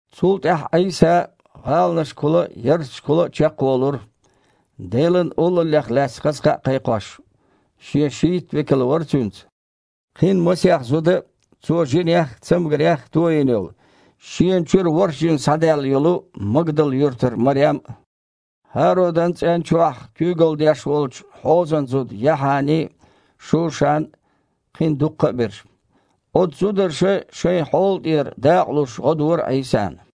Цул тІаьхьа Іийса гІаланашкахула а, ярташкахула а чекхволура, Делан Олаллех лаьцна хаза кхаъ кхайкхош. Шен шийтта векал вара Цуьнца, кхин масех зуда а, Цо жинех а, цамгарех а тойина йолу: шена чуьра ворхІ жин схьадаьлла йолу Магдал-юьртара Марем а, ХІародан цІен чохь куьйгалла деш волчу Хьозан зуда Яхьани а, Шушан а, кхин дуккха а берш. Оцу зударша шайн хьола тІера дакъа луш гІо дора Іийсана.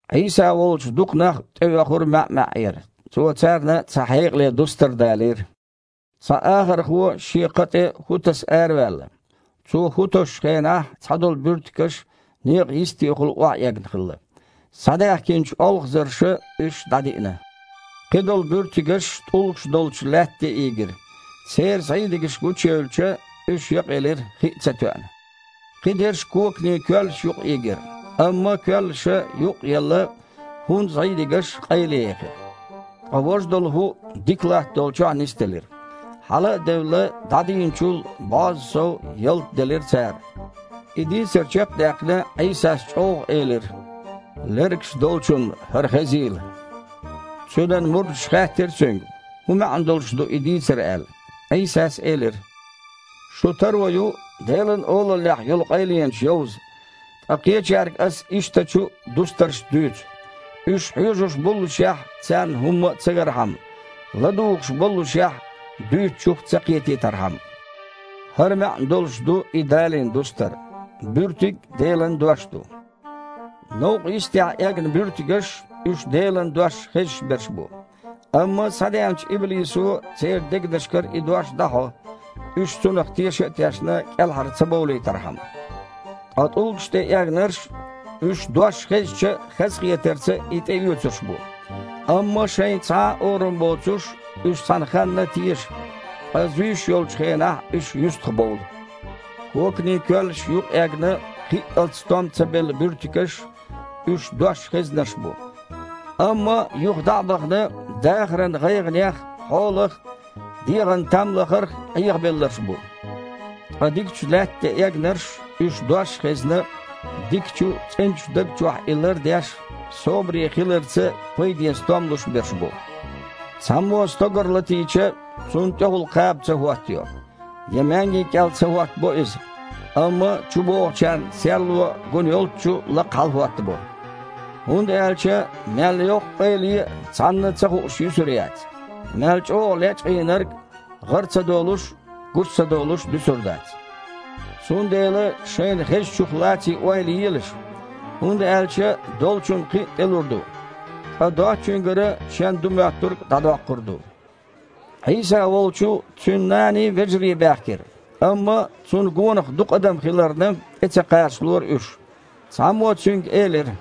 Іийса волчу дукха нах тІеоьхура маьІ-маьІІера. Цо царна цхьа хьекъале дустар далийра: «Цхьа ахархо шен кха тІе хІу таса араваьлла. Цо хІу тосучу хенахь цхьадолу буьртигаш некъан йистехула охьаэгна хилла. Схьадаьхкинчу олхазарша уьш дІадиъна. Кхидолу буьртигаш тІулгаш долчу лаьтта тІе ийгира. Церан зІийдигаш гучуевлча, уьш якъаелира, хи а ца тоьъна. Кхидерш коканийн коьллаш юкъа ийгира, амма коьллаша, юкъ а елла, хІун зІийдигаш къайлаехира. Ткъа важа долу хІу дика латта долчохь нисделира. Хьала а девлла, дІадийначул бІозза сов ялта делира цара». И дийцар чекх а даьккхина, Іийсас чІоггІа элира: «Лергаш долчунна хІара хезийла!» Цуьнан мурдаша хаьттира Цуьнга, хІун маьІна долуш ду и дийцар аьлла. Іийсас элира: «Шун таро ю Делан Олаллех йолу къайленаш йовза, ткъа кхечаьрга Ас ишттачу дустаршца дуьйцу, уьш „хьоьжуш боллушехь, царна хІумма а ца гархьама, ладугІуш боллушехь, дуьйцучух ца кхетийтархьама“. ХІара маьІна долуш ду и далийна дустар: буьртиг Делан дош ду. Новкъа йистехь эгна буьртигаш – уьш Делан дош хезаш берш бу. Амма схьадеанчу иблисо церан дегнашкара и дош дІахьо, уьш, цунах теша а тешна, кІелхьара ца бовлийтархьама. Ткъа тІулгаш тІе эгнарш – уьш, дош хезча, хазахетарца и тІеоьцурш бу. Амма шайн цхьа а орам боцуш, уьш цхьана ханна теша, ткъа зуьйш йолчу хенахь, уьш юьстахбовлу. Коканийн коьллаш юкъа эгна, кхиъалц стом ца белла буьртигаш – уьш дош хезнарш бу, амма юха дІа а бахана, дахаран гІайгІанех, хьолах, дегІана там лахарх Іехабелларш бу. Ткъа дикачу лаьтта тІе эгнарш – уьш, дош а хезна, дикачу, цІеначу даг чохь и лардеш, собаре хиларца пайден стом луш берш бу». «Цхьаммо стогар латийча, цунна тІехула кхаба ца хІоттайо, я маьнги кІел ца хІоттабо иза, амма чубогІучарна серло гун йолччу лакха хьалахІоттабо. ХІунда аьлча мел йоккха къайле а цхьанна ца хууш юьсур яц, мел чІогІа лечкъийнарг а гІара ца долуш а, гучу ца долуш а дуьсур дац. Цундела шайна хезачух лаций ойла елаш. ХІунда аьлча долчунна кхин а тІелур ду, ткъа доцучуьнгара шен ду моьттург а дІадоккхур ду». Іийса волчу Цуьнан наний, вежарий баьхкира, амма Цунна гонах дукха адам хиларна, тІе ца кхачалора уьш. Цхьаммо Цуьнга элира: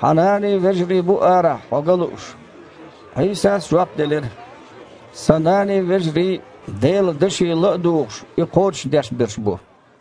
«Хьан наний, вежарий бу арахь Хьо ган лууш». Іийсас жоп делира: «Сан наний, вежарий Делан даше ла а дугІуш, и кхочушдеш берш бу».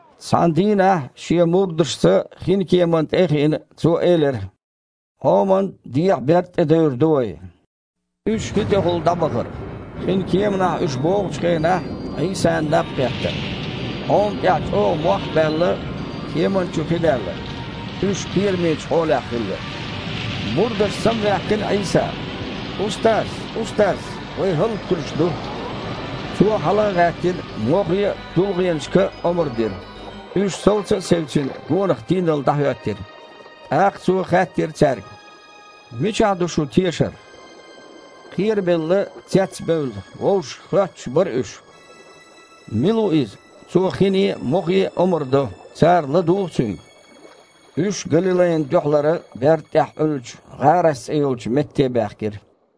Цхьана дийнахь Шен мурдашца хинкеманна тІе а хиина, Цо элира: «Іоман дехьа берда тІе девр ду вай». Уьш хи тІехула дІабахара. Хин кеманахь уьш богІучу хенахь, Іийсана наб кхетта. Іома тІехь чІогІа мох а баьлла, кеманна чу хи даьлла. Уьш кхерамечу хьолехь хилла. Мурдаша самаваьккхина Іийса: «Устаз! Устаз! Вай хІаллакьхуьлуш ду!» Цо, хьала а гІаьттина, мохе а, тулгІенашка а омра дира. Уьш совца а севцина, гонах тийналла дІахІоьттира. ТІаккха Цо хаьттира цаьрга: «Мичахь ду шун тешар?» Кхерабелла, цецбевлла вовшашка хоьттуш бара уьш: «Мила ву Иза? Цо хине а, мохе а омра до, цара ладугІу Цуьнга». Уьш Галилайна дуьхьалара берда тІехь Іуьллучу ГІарас цІе йолчу метте баьхкира.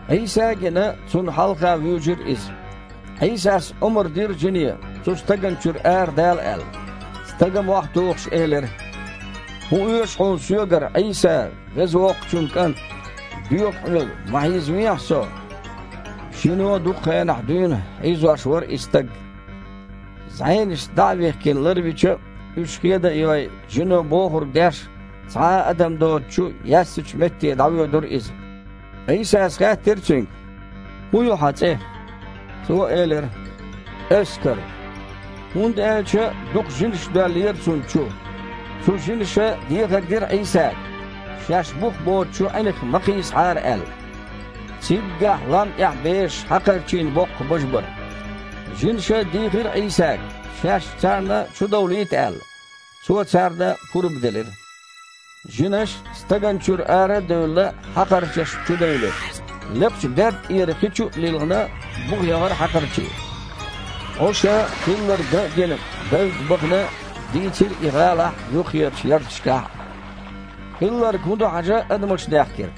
Іийса а гина, Цунна хьалха вуьйжира иза. Іийсас омра дира жине, оцу стагана чуьра арадала аьлла. Стага мохь тухуш элира: «ХІун оьшу Хьуна соьгара, Іийса, Веза Воккхачун КІант? Доьху Хьоьга, ма хьийзавехьа со». Жино дукха хенахь дуьйна хьийзош вара и стаг. ЗІенашца дІа а вихкина, ларвича а, уьш хеда а йой, жино бохург деш, цхьа а адам доцучу, яьссачу метте дІавоьдура иза. Іийсас хаьттира цуьнга: «ХІун ю хьан цІе?» Цо элира: «Эскар», хІунда аьлча дукха жинаш доьллера цунна чу. Цу жинаша дехар дира Іийсага, шаьш бух боцучу Іинах ма кхийсахьара аьлла. Циггахь лам тІехь бежаш хьакхарчийн боккха бажа бара. Жинаша дийхира Іийсага, шаьш царна чу довлийта аьлла. Цо царна пурба делира. Жинаш, стагана чуьра ара а девлла, хьакхарчашна чудевлира. Лекхачу берда тІера хи чу а лилхина, буха яхара хьакхарчий. Іуша, хилларг ган а гина, бевдда бахана дийцира и гІалахь а, юххерчу ярташкахь а. Хилларг хІун ду хьажа адамаш даьхкира.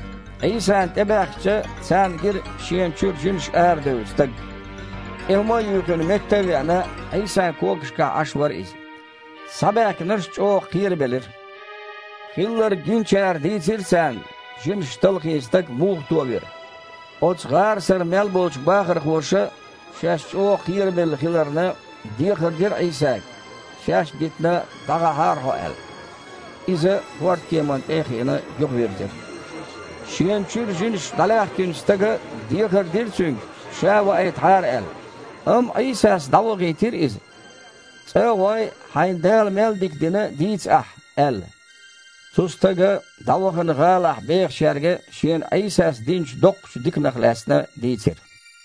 Іийсана тІебаьхкича, царна гира шена чуьра жинаш арадевлла стаг. ТІе хІума а юьйхина, метта а веана, Іийсан когашкахь Іаш вара иза. Схьабаьхкинарш чІогІа кхерабелира. Хилларг гиначара дийцира царна, жинаша талхийна стаг муха товира. Оцу ГІарасара мел болчу бахархоша, шаьш чІогІа кхерабелла хиларна, дехар дира Іийсага, шаьш а дитина, дІагІахьара Хьо аьлла. Иза хІордкемана тІе а хиина юхавирзира. Шена чуьра жинаш дІалаьхкинчу стага дехар дира Цуьнга, ша а ваийтахьара аьлла. Амма Іийсас дІавахийтира иза: «ЦІа а гІой, хьайна Дала мел дика дина дийца ахь», – аьлла. Цу стага дІавахана гІалахь бехачаьрга шена Іийсас динчу доккхачу диканах лаьцна дийцира.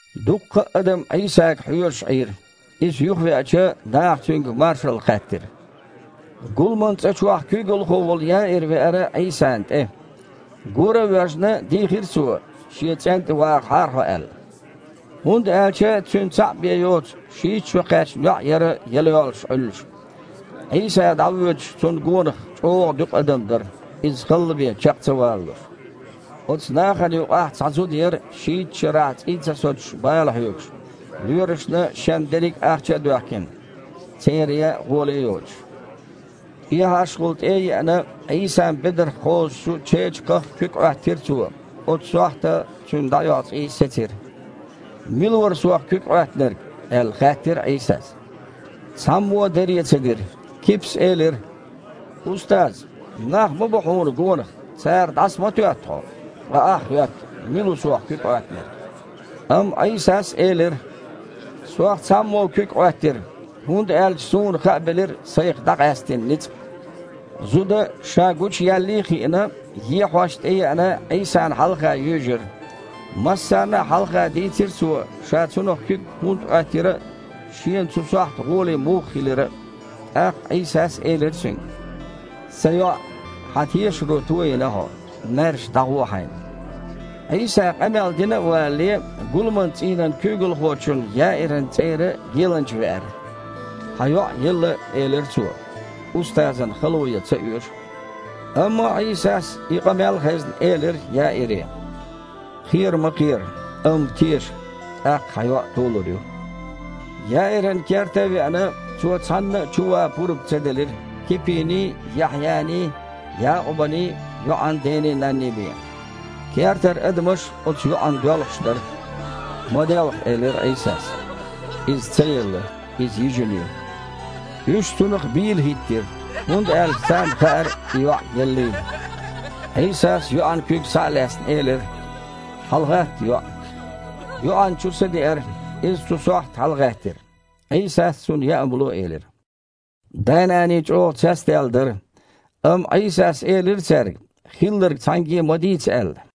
Дуккха а адам Іийсага хьоьжуш Іийра. Иза юхавеача, наха Цуьнга маршалла хаьттира. Гуламан цІа чохь куьйгалхо волу Яир веара Іийсана тІе. Гора а воьжна, дийхира цо, шен цІен тІе вагІахьара Хьо аьлла. ХІунда аьлча цуьнан цхьаъ бен йоцу, шийтта шо кхаьчна йоІ яра яла йоллуш Іуьллуш. Іийса дІавоьдуш Цунна гонах чІогІа дуькъа адам дара, Иза халла бен чекх ца валалуш. Оцу нахана юкъахь цхьа зуда яра шийтта шарахь цІий ца соцуш бала хьоьгуш, лоьрашна шен дерриг ахча а доьхкина, церан ян гІоле а йоцуш. ТІехьашхула тІе а еана, Іийсан бедарх кхозучу чечакхах куьг Іоьттира цо, оцу сохьта цуьнан дІаоьху цІий сецира. «Мила вара Сох куьг Іоьттинарг?» – аьлла, хаьттира Іийсас. Цхьаммо а даре ца дира. Кипас элира: «Устаз! Нах ма бу Хьуна гонах, цара дІаса ма тоьтту Хьо, ткъа Ахь хоьтту: „Мила ву Сох куьг Іоьттинарг?“» Амма Іийсас элира: «Сох цхьаммо куьг Іоьттира, хІунда аьлча Суна хаабелира Сайх дІакъаьстина ницкъ». Зуда, ша гучуяьллий а хиина, ехьош тІееана, Іийсана хьалха юьйжира. Массарна а хьалха дийцира цо, ша Цунах куьг хІунда Іоьттира а, шена оцу сохьта гІоле муха хилира а. ТІаккха Іийсас элира цуьнга: «Сан йоІ, хьан тешаро тойина хьо. Маьрша дІагІо хьайна». Іийса къамел дина а валале, гуламан цІийнан куьйгалхочун Яиран цІера геланча веара. «Хьан йоІ елла, – элира цо. – Устазана хало ян ца оьшу». Амма Іийсас, и къамел а хезна, элира Яире: «Кхера ма кхера, амма теша, тІаккха хьан йоІ толур ю». Яиран керта а веана, Цо цхьанна а чу ван пурба ца делира, Кипиний, Яхьъяний, Якъубаний, йоІан дений-нанний бен. Кертара адамаш оцу йоІана доьлхуш дара. «Ма делха, – элира Іийсас, – иза ца елла, иза йижина ю». Уьш Цунах бийла хІиттира, хІунда аьлча царна хаьара и йоІ еллийла. Іийсас, йоьІан куьг схьа а лаьцна, элира: «ХьалагІатта, йоІ!» ЙоІана чу са деара, иза цу сохьта хьалагІаьттира. Іийсас цунна яа хІума ло элира. Дай-наний чІогІа цецдаьлла дара. Амма Іийсас элира цаьрга, хилларг цхьаьнгге а ма дийца аьлла.